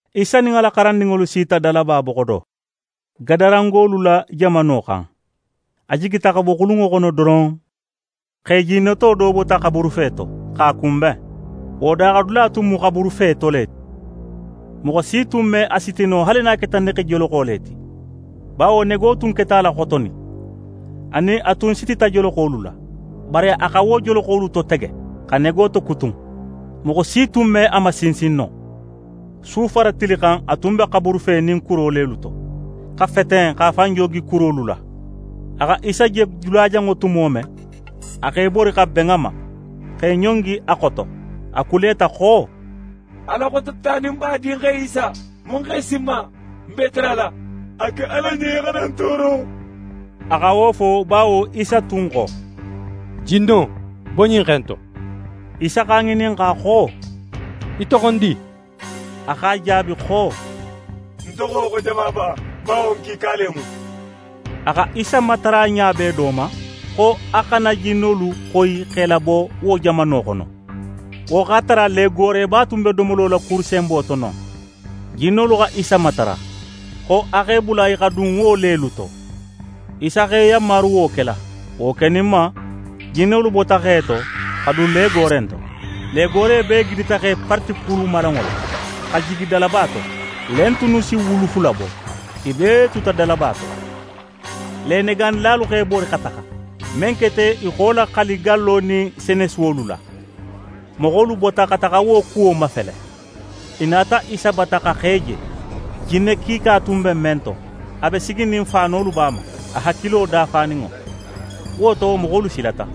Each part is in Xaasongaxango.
Isa nin a la xarandinŋolu sita dalaba boxo do, Gadarangolu la jamano xan. A jigita xa bo xulunŋo xono doron, xe jinneto do bota xaburufe to, x'a kunben. Wo daaxadula tun mu xaburufe to le ti; moxo si tun me a siti no, haali nin a keta negejoloxo le ti. Bawo nego tun keta a la xotonin; anin a tun sitita joloxolu la. Bari a xa wo joloxolu totege, xa nego tokutun. Moxo si tun me a masinsin no. Su fara tili xan, a tun be xaburufe nin kuro lelu to, xa feten, x'a fan joogi kurolu la. A xa Isa je dulajanŋo tumo men, a x'é bori, xa ben a ma, x'é ɲongi a xoto. A kuleta xo: «Ala Xototaninba Dinxe Isa, mun x'é si ń ma? Ń b'é tarala, a ke Ala ɲen í xana ń tooro.» A xa wo fo, bawo Isa tun xo: «Jinno, bo ɲin xe in to.» Isa x'a ŋininxa xo: «Í toxondi?» A x'a jaabi xo: «Ń toxo xo Jamaba; bawo n kiika le mu.» A xa Isa matara ɲa bee do ma, xo a xana jinnolu xoyi x'e labo wo jamano xono. Wo x'a tara legooreba tun be domolo la kuru senbo to non. Jinnolu xa Isa matara, xo a x'e bula i xa dun wo lelu to. Isa x'e yanmaru wo kela. Wo keninma, jinnolu bota xe to, xa dun legoore in to. Legoore bee gidita x'e parati kurumalanŋo la, xa jigi dalaba to. Le in tunnu si wulu fula bo; i bee tuta dalaba to. Lenegaanilalu x'e bori, xa taxa. Men keta, i xa wo laxali gallo nin senesuwolu la. Moxolu bota, xa taxa wo kuwo mafele. I nata Isa bata, xa xe je, jinne kiika tun be men to, a be siginin, faanolu b'a ma, a hakilo dafaninŋo. Wo to, moxolu silata.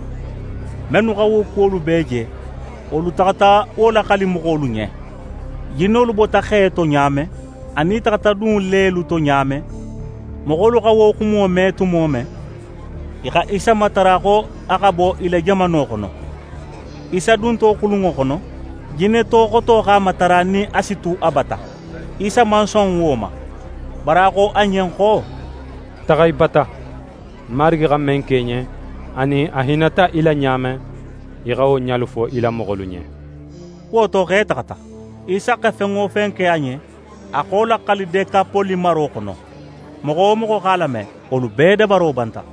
Mennu xa wo kuwolu bee je, wolu taxata wo laxali moxolu ɲen: Jinnolu bota xe to ɲa men, anin i taxata dun lelu to ɲa men. Moxolu xa wo xumo me tumo men, i xa Isa matara xo a xa bo i la jamano xono. Isa dunto xulunŋo xono, jinneto xoto x'a matara nin a si tu a bata. Isa man son wo ma, bari a xo a ɲen xo: «Taxa í bata. Marigi xa men ke í ɲen, anin a hinnata í la ɲa men, í xa wo ɲalu fo í la moxolu ɲen.» Wo to, xe taxata. Isa xa fen wo fen ke a ɲen, a xa wo laxali Dekapole maro xono. Moxo wo moxo x'a lame, wolu bee dabaro banta.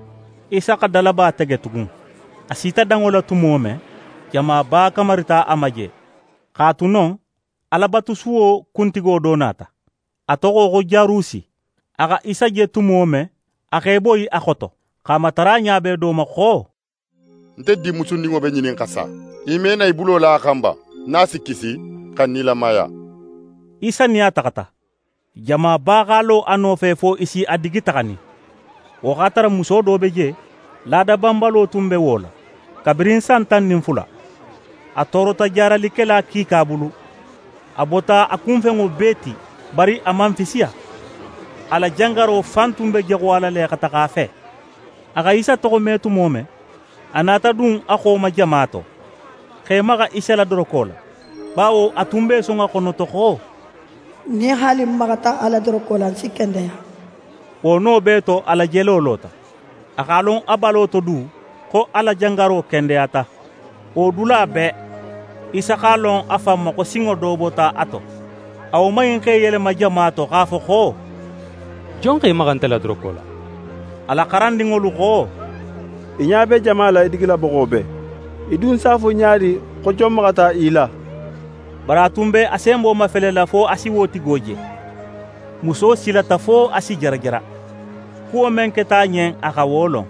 Isa xa dalaba tege tugun. A sita danŋo la tumo men, jamaba kamarita a ma je. X'a tu non, Alabatusuwo kuntigo do nata. A toxo xo Jarusi. A xa Isa je tumo men, a x'é boyi a xoto, x'a matara ɲa bee do ma xo: «Nte dinmusundinŋo be ŋinin xa sa. Í me na í bulo la a xan ba, nin a si kisi, xa nilamaya?» Isa nin a taxata. Jamaba x'a lo a nofe fo i si a digi taxanin. Wo x'a tara muso do be je, laada banbalo tun be wo la, kabirin san tan nin fula. A toorota jaaralikela kiika bulu; a bota a kunfenŋo bee ti, bari a man fisiya. A la jangaro fan tun be jaxuyala le xa taxa a fe. A xa Isa toxome tumo men, a nata dun a xo ma jama to, x'é maxa Isa la doroko la. Bawo a tun be í son a xonoto xo: «Nin haali ń maxata a la doroko la, ń si kendeya.» Wo no bee to, a la jelo lota. A x'a lon a balo to du, xo a la jangaro kendeyata. Wo dula bee, Isa x'a lon a fan ma xo sinŋo do bota a to. A woman in x'é yelema jama to, x'a fo xo: «Jon x'é maxa nte la doroko la?» A la xarandinŋolu xo: «Í ɲa be jama la í digila boxo bee! Í dun si a fo ɲa di xo jon maxata í la?» Bari a tun be a senbo mafelela fo a si wo tigo je. Muso silata fo a si jarajara; kuwo men keta a ɲen, a xa wo lon.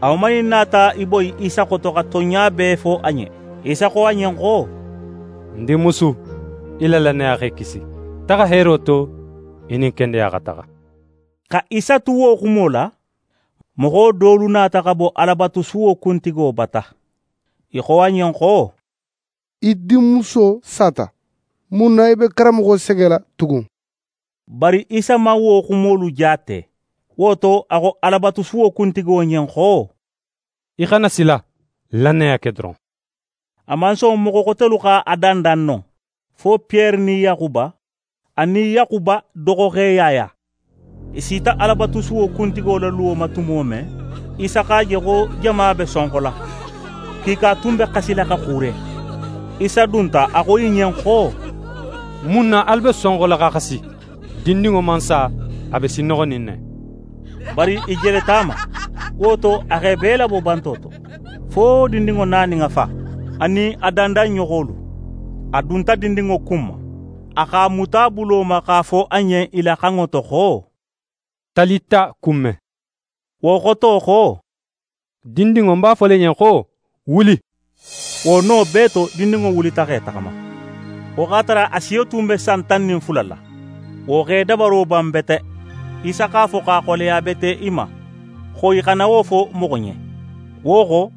A woman in nata í boyi Isa xoto xa tonɲa bee fo a ɲen. Isa xo a ɲen xo: «Ń dinmusu, í la lannaya x'é kisi. Taxa heero to; í nin kendeya xa taxa.» Xa Isa tu wo xumo la, moxo dolu nata xa bo Alabatusuwo kuntigo bata. I xo a ɲen xo: «Í dinmuso sata. Mun na í be karanmoxo segela tugun?» Bari Isa man wo xumolu jaate; wo to, a xo Alabatusuwo kuntigo ɲen xo: «Í xana sila! Lannaya ke doron!» A man son moxo xotelu x'a dandan non, fo Piyere nin Yaxuba anin Yaxuba doxoxe Yaya. I sita Alabatusuwo kuntigo la luwo ma tumo men, Isa x'a je xo jama be sonxola. Kiika tun be xasila, xa xuure. Isa dunta, a xo i ɲen xo: «Mun na alu be sonxola, xa xasi? Dindinŋo man sa. A be sinnoxonin ne.» Bari, i jeleta a ma. Wo to, a x'e bee labo banto to, fo dindinŋo na nin a fa, anin a dandanɲoxolu. A dunta dindinŋo kunma. A x'a muta a bulo ma, x'a fo a ɲen i la xanŋo to xo: «Talita kume». Wo xoto xo: «Dindinŋo, ń b'a fola í ɲen xo: Wuli!» Wo no bee to, dindinŋo wulita, x'é taxama. Wo x'a tara a siyo tun be san tan nin fula la. Wo x'e dabaro ban bete. Isa x'a fo, x'a xoleya bete i ma, xo i xana wo fo moxo ɲen. Wo xo,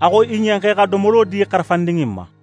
a xo i ɲen xo i xa domolo di xarafandin in ma.